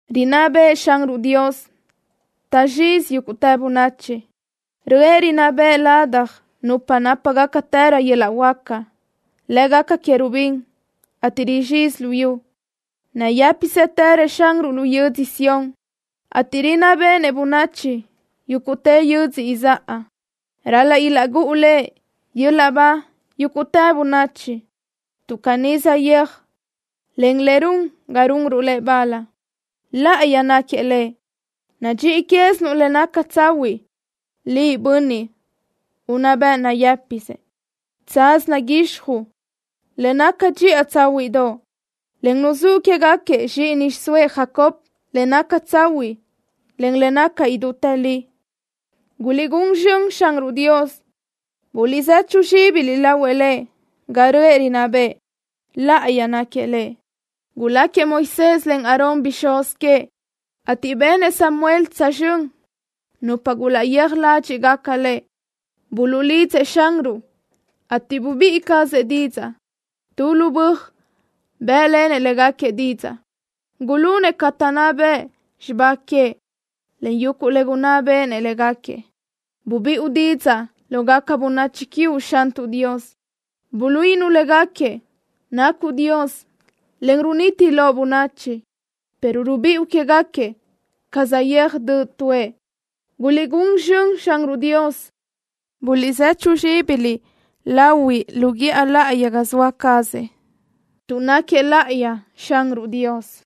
¡Rinná bëʼë Xanruʼ Dios! Taʼzxizi yúguʼtë bönachi. Röʼë rinná bëʼë ladaj nupa nápagacatërö yöl-laʼ huáca, lë́gaca Querubín, ateʼ rizxizi luyú. Nayë́pisëtërëʼ Xanruʼ lu yödzö Sión, ateʼ rinná béʼenëʼ bönachi yúguʼtë yödzö izáʼa. Ral-laʼ ilaʼgúʼu Lëʼ yöl-laʼ ba yúguʼtë bönachi, tuʼ caní saʼyéaj, en le run ga runruʼ Lëʼ bal. ¡Láʼayi náquiëʼ Lëʼ! Nadxíʼi quézinuʼ le naca tsahuiʼ, Liʼ, Bönniʼ unná bëʼ nayë́pisë. Tsaz naguixjuʼ le naca dxiʼa tsáhuiʼdoʼ, en nuzúʼ quégaquiëʼ zxíʼini xiʼsóëʼ Jacob le naca tsahuiʼ, en le naca idútë li. ¡Guliʼgún zxönëʼ Xanruʼ Dios! Buliʼzechu zxíbiliʼ lahuëʼ Lëʼ ga röʼë rinná bëʼë. ¡Láʼayi náquiëʼ Lëʼ! Guláquiëʼ Moisés, en Aarón bixúz queëʼ, ateʼ benëʼ Samuel tsözxö́n nupa gulaʼyéaj ládxiʼgaca Lëʼ. Buluʼlidzëʼ Xanruʼ, ateʼ bubíʼi cazëʼ didzaʼ. Tu lu böaj bë́ʼlenëʼ légaquiëʼ didzaʼ. Gulunëʼ ca taʼnná bëʼ xibá queëʼ, en yuguʼ le gunná béʼenëʼ légaquiëʼ. Bubiʼu didzaʼ lógaca bönachi quiuʼ, Xantuʼ Dios. Buluíʼinuʼ légaquiëʼ nacuʼ Dios, en runiti loʼ bönachi, pero rubiʼu quégaquiëʼ ca saʼyéaj döʼ tuʼë. ¡Guliʼgún zxönëʼ Xanruʼ Dios! ¡Buliʼzechu zxíbiliʼ lahuiʼ lo guíʼa láʼayi ga zoa cazëʼ, tuʼ náquiëʼ láʼayi Xanruʼ Dios!